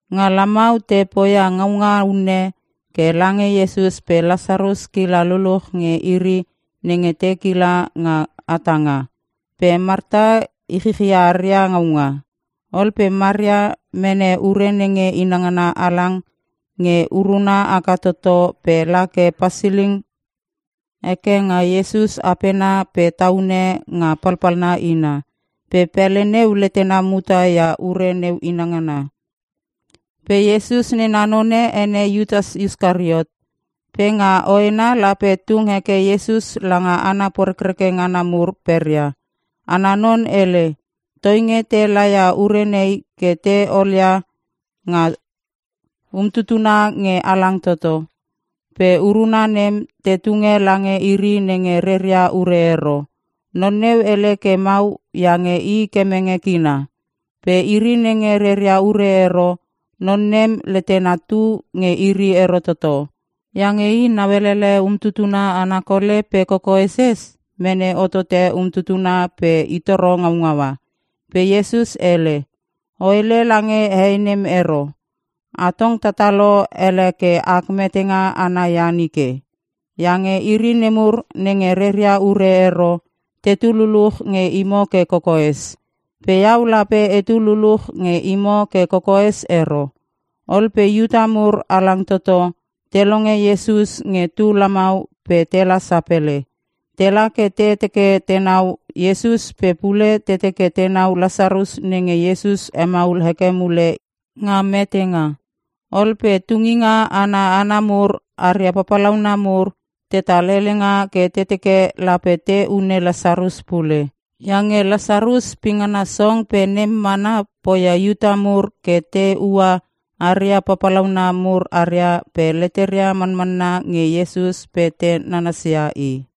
Nga lamau te poia ngaunga unne ke lange Iesus pe Lasarus kila luluch nge iri nenge te kila nga hatanga. Pe Marta ichichia aria ngaunga. Ol pe Maria mene ure nenge inangana halang nge uruna haka toto pe la ke pasiling heke nga Iesus apena pe taunune nga palpalna ina. Pe pele neu letena muta ia ure neu inangana. Pe Iesus nena none ene Iutas Iskariot. Pe nga hoena lape tung heke Iesus langa hana porekreke ngana mur peria. Ana non hele, “Toinge te laia ure nei ke te olia nga umtutuna nge halang toto. Pe uruna nem te tunge lange iri nenge reria ure ero.” Non neu hele ke mau iange i kemenge kina. Pe iri nenge reria ure ero, non nem letena tu nge iri ero toto. Iange i nauelele umtutuna ana kole pe kokoeses mene hotote umtutuna pe i toro ngaungaua. Pe Iesus hele, “O hele lange hei nem ero. Atong tatalo ele ke ak metenga ana ia nike. Iange iri nemur nenge reria ure ero tetu luluch nge imo ke kokoes. Pe iau lape etu luluch nge imo ke kokoes ero.” Ol pe Iuta mur halang toto te longe Iesus nge tu lamau pe tela sapele. Tela ke te teke tenau Iesus pe pule te teke tenau Lasarus nenge Iesus hemaul heke mule nga metenga. Ol pe tunginga ana hana mur aria papalauna mur, tetal helenga ke te teke lape te hune Lasarus pule. Iange Lasarus pingana song pe nem mana poia Iuta mur ke te ua aria papalauna mur aria pe leteria manmanna nge Iesus pe te nanasia i.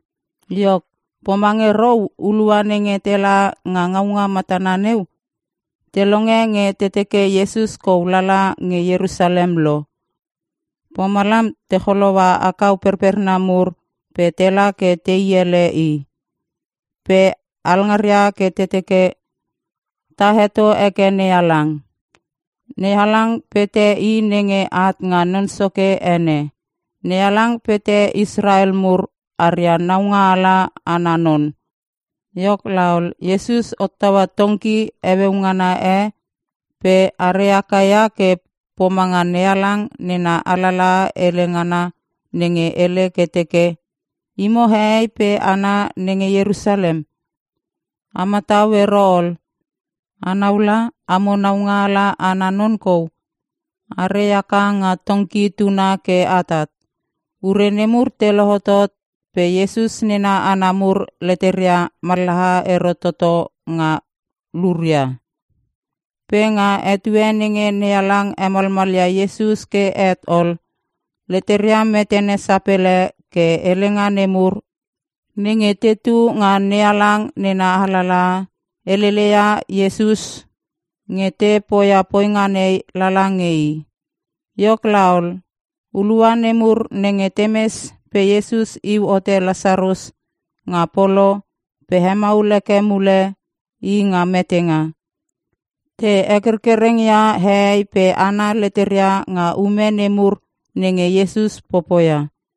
Iok, pomange rou hulua nenge tela nga ngaunga matana neu te longe nge te teke Iesus kou lala nge Ierusalem lo. Pomalam te choloua akau perperna mur pe tela ke tei ele i. Pe alngaria ke te teke, “Ta heto heke NeHalang! NeHalang pete i nenge at nga Non Soke ene! NeHalang pete Israel mur aria Naungaala ana non!” Iok laol, Iesus hottaua tongki heueu ngana e pe are haka ia ke pomanga NeHalang nena alalaha hele ngana nenge hele ke teke, “Imo hehei pe hana nenge Ierusalem, a matau ero ol! Anau la, amo naungaala ana non kou are haka nga tongki tuna ke atat.” Ure nemur te lohotot pe Iesus nena hana mur leteria mallaha ero toto nga luria. Pe nga etue nenge NeHalang hemalmalia Iesus ke het ol, leteria metene sapele ke helenga nemur nenge te tetu nga NeHalang nena alalaha, helele ia Iesus nge te poia poinga nei lala nge i. Iok laol, hulua nemur nenge temes pe Iesus iu hote Lasarus nga polo pe hemaul heke mule i nga metenga, te hekerkereng ia hehei pe hana leteria nga ume nemur nenge Iesus popoia.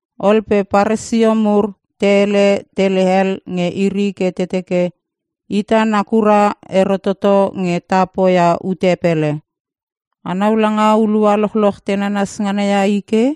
Ol pe Paresio mur te hele tele hel nge iri ke te teke, “Ita nakura ero toto nge ta poia ute pele. Anau langa hulua lochloch te nanas ngana ia i ke.”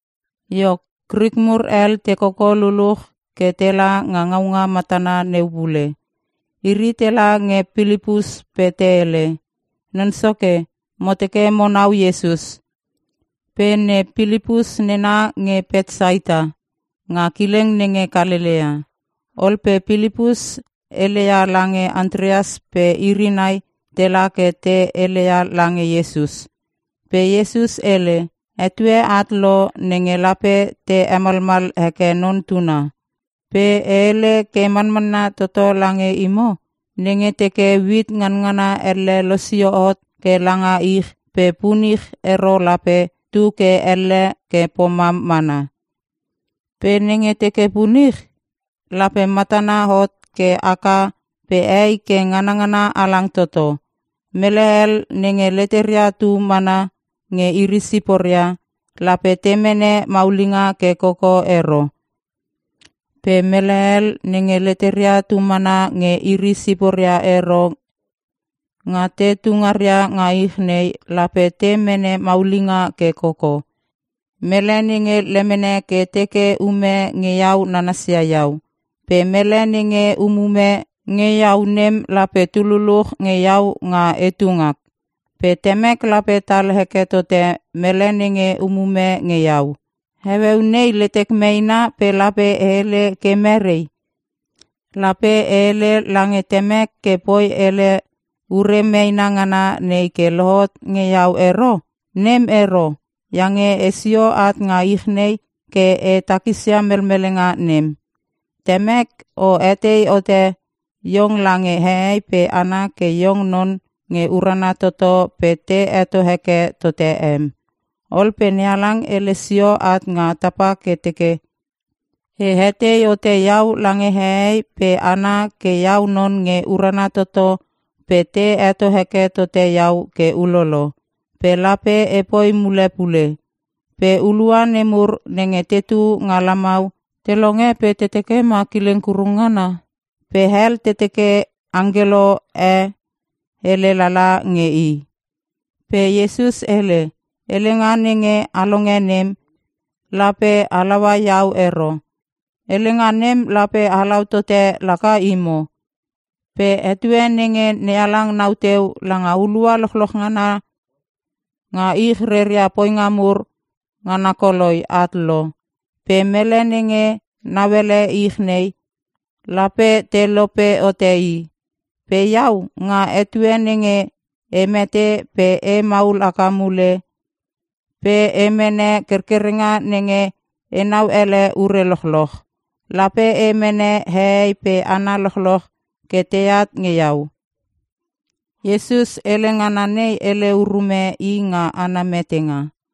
Iok, Krik mur hel te koko luluch ke tela nga ngaunga matana neu pule. Iri tela nge Pilipus pe te hele, “Non soke, mo teke monau Iesus.” Pe ne Pilipus nena nge Petsaita nga kileng nenge Kalelea. Ol pe Pilipus heleia lange Antreas pe iri nai tela ke te heleia lange Iesus. Pe Iesus hele, “Etue at lo nenge lape te hemalmal heke Non Tuna. Pe e hele ke manmanna toto lange imo. Nenge teke uit nganangana elle losio hot ke langa ich pe punich ero lape tu ke elle ke pomam mana. Pe nenge teke punich lape matana hot ke haka pe hei ke nganangana halang toto. Mele hel nenge leteria tu mana nge iri siporia, lape te mene maulinga ke koko ero. Pe mele hel nenge leteria tumana nge iri siporia ero, nga te tungaria nga ich nei, lape te mene maulinga ke koko. Mele nenge lemene ke teke ume nge iau nanasia iau. Pe mele nenge umume nge iau nem lape tu luluch nge iau nga etu ngak. Pe Temek lape tal heke tote mele nenge umume nge iau. “Heueu nei letek meena pe lape e hele ke merei? Lape e hele lange temek ke poi ele ure meena ngana nei ke lohot nge iau ero? Nem ero, iange esio at nga ich nei ke e takisia melmelenga nem. “Temek o hetei hote iong lange hehei pe hana ke iong non nge urana toto pe te heto heke tote em.” Ol pe NeHalang hele sio at nga tapa ke teke, “E hetei hote iau lange hehei pe hana ke iau non nge urana toto pe te heto heke tote iau ke ulolo, pe lape epoi mule pule.” Pe hulua nemur nenge tetu nga lamau te longe pe te teke ma kileng kurung ngana. Pe hel te teke angkelo e hele lala nge i. Pe Iesus hele, “Helenga nenge a longe nem lape halaua iau ero. Helenga nem lape halau tote laka imo. Pe etue nenge NeHalang nau teu langa hulua lochloch ngana nga ich reria poinga mur ngana koloi at lo. Pe mele nenge nauele ich nei lape te lope hote i. Pe Iau, nga etue nenge e mete pe e maul haka mule pe e mene kerkerenga nenge enau ele ure lochloch, lape e mene hehei pe hana lochloch ke teat nge iau.” Iesus hele ngana nei hele urume i nga ana metenga.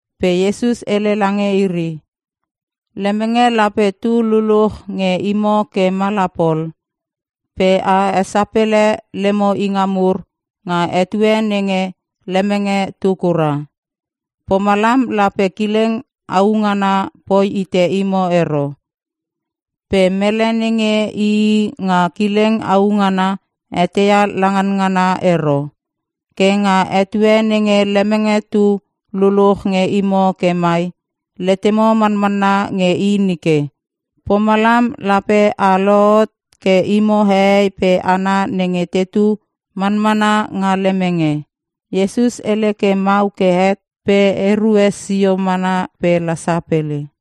Pe Iesus hele lange iri, “Lemenge lape tu luluch nge imo ke mala pol. Pe a esapele lemo inga mur nga etue nenge lemenge tu kura. Pomalam lape kileng au ngana poi hite imo ero. Pe mele nenge ii nga kileng au ngana eteia la nganngana ero. Ke nga etue nenge lemenge tu luluch nge imo ke mai, letemo manmanna nge i nike. Pomalam lape a lohot ke imo hehei pe hana nenge tetu manmana nga lemenge.” Iesus hele ke mau ke het pe erue sio mana pe la sapele.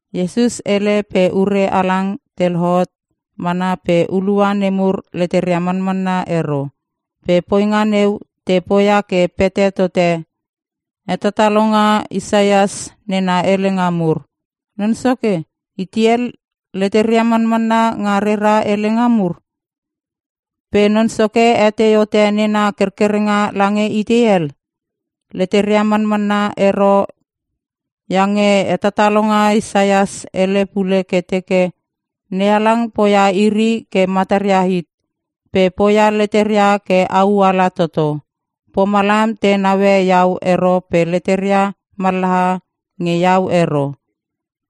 Iesus hele pe ure halang te lohot mana pe hulua nemur leteria manmanna ero. Pe poinga neu te poia ke pete tote hetatalonga Isaias nena helenga mur. “Non Soke, itei hel leteria manmanna nga rera helenga mur? Pe Non Soke hetei hote nena kerkerenga lange itei hel?” Leteria manmanna ero iange hetatalonga Isaias hele pule ke teke, “NeHalang poia iri ke mataria hit pe poia leteria ke au ala toto. Pomalam te naue iau ero pe leteria mallaha nge iau ero.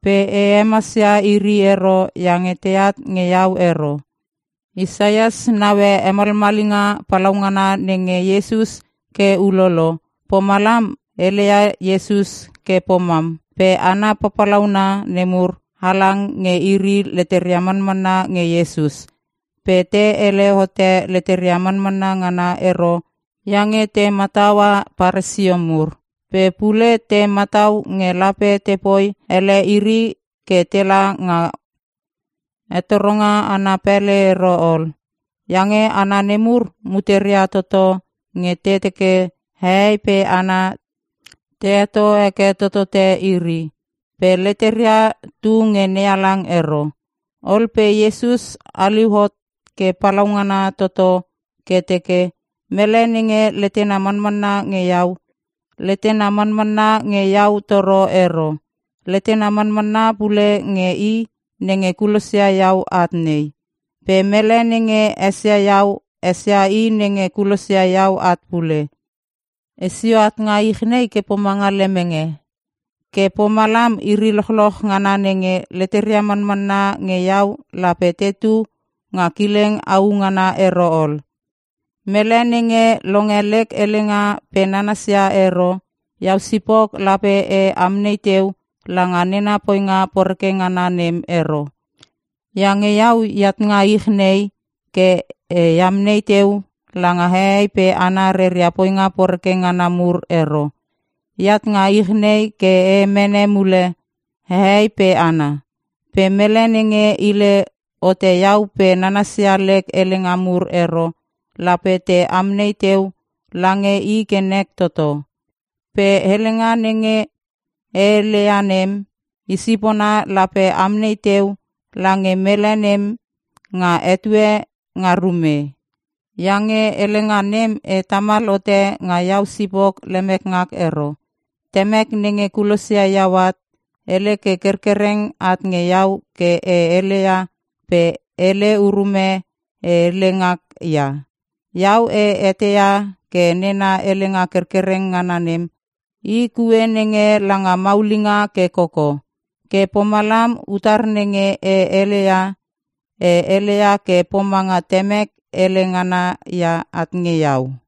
Pe e hemasia iri ero iange teat nge iau ero.” Isaias naue hemalmalinga palaungana nenge Iesus ke ulolo, pomalam heleia Iesus ke pomam. Pe hana papalauna nemur, halang nge iri leteria manmanna nge Iesus. Pe te hele hote leteria manmanna ngana ero iange te mataua Paresio mur. Pe pule te matau nge lape tepoi ele iri ke tela nga hetoronga ana pele ero ol. Iange hana nemur muteria toto nge te teke hehei pe hana te heto heke totote iri. Pe leteria tu nge NeHalang ero. Ol pe Iesus haliu hot ke palaungana toto ke teke, “Mele nenge letena manmanna nge iau, letena manmanna nge iau toro ero. Letena manmanna pule nge i nenge kulosia iau at nei. Pe mele nenge esia iau esia i nenge kulosia iau at pule. Esio at nga ich nei ke pomanga lemenge. Ke pomalam iri lochloch ngana nenge leteria manmanna nge iau lape tetu nga kileng au ngana ero ol. “Mele nenge longe lek helenga pe nanasia ero, iau sipok lape e amnei teu langa nena poinga poreke ngana nem ero. Iange iau eat nga ich nei ke e amnei teu langa hehei pe hana reria poinga poreke ngana mur ero. Eat nga ich nei ke e mene mule hehei pe hana. Pe mele nenge hile hote iau pe nanasia lek helenga mur ero, lape te amnei teu lange i ke nek toto. Pe helenga nenge e heleia nem i sipona lape amnei teu lange mele nem nga etue nga rume. Iange helenga nem e tamal hote nga iau sipok lemek ngak ero. Temek nenge kulosia iau at hele ke kerkereng at nge iau ke e heleia pe hele urume e hele ngak ia. Iau e eteia ke nena helenga kerkereng ngana nem, i kue nenge langa maulinga ke koko. Ke pomalam utar nenge e heleia, e heleia ke pomanga Temek hele ngana ia at nge iau.”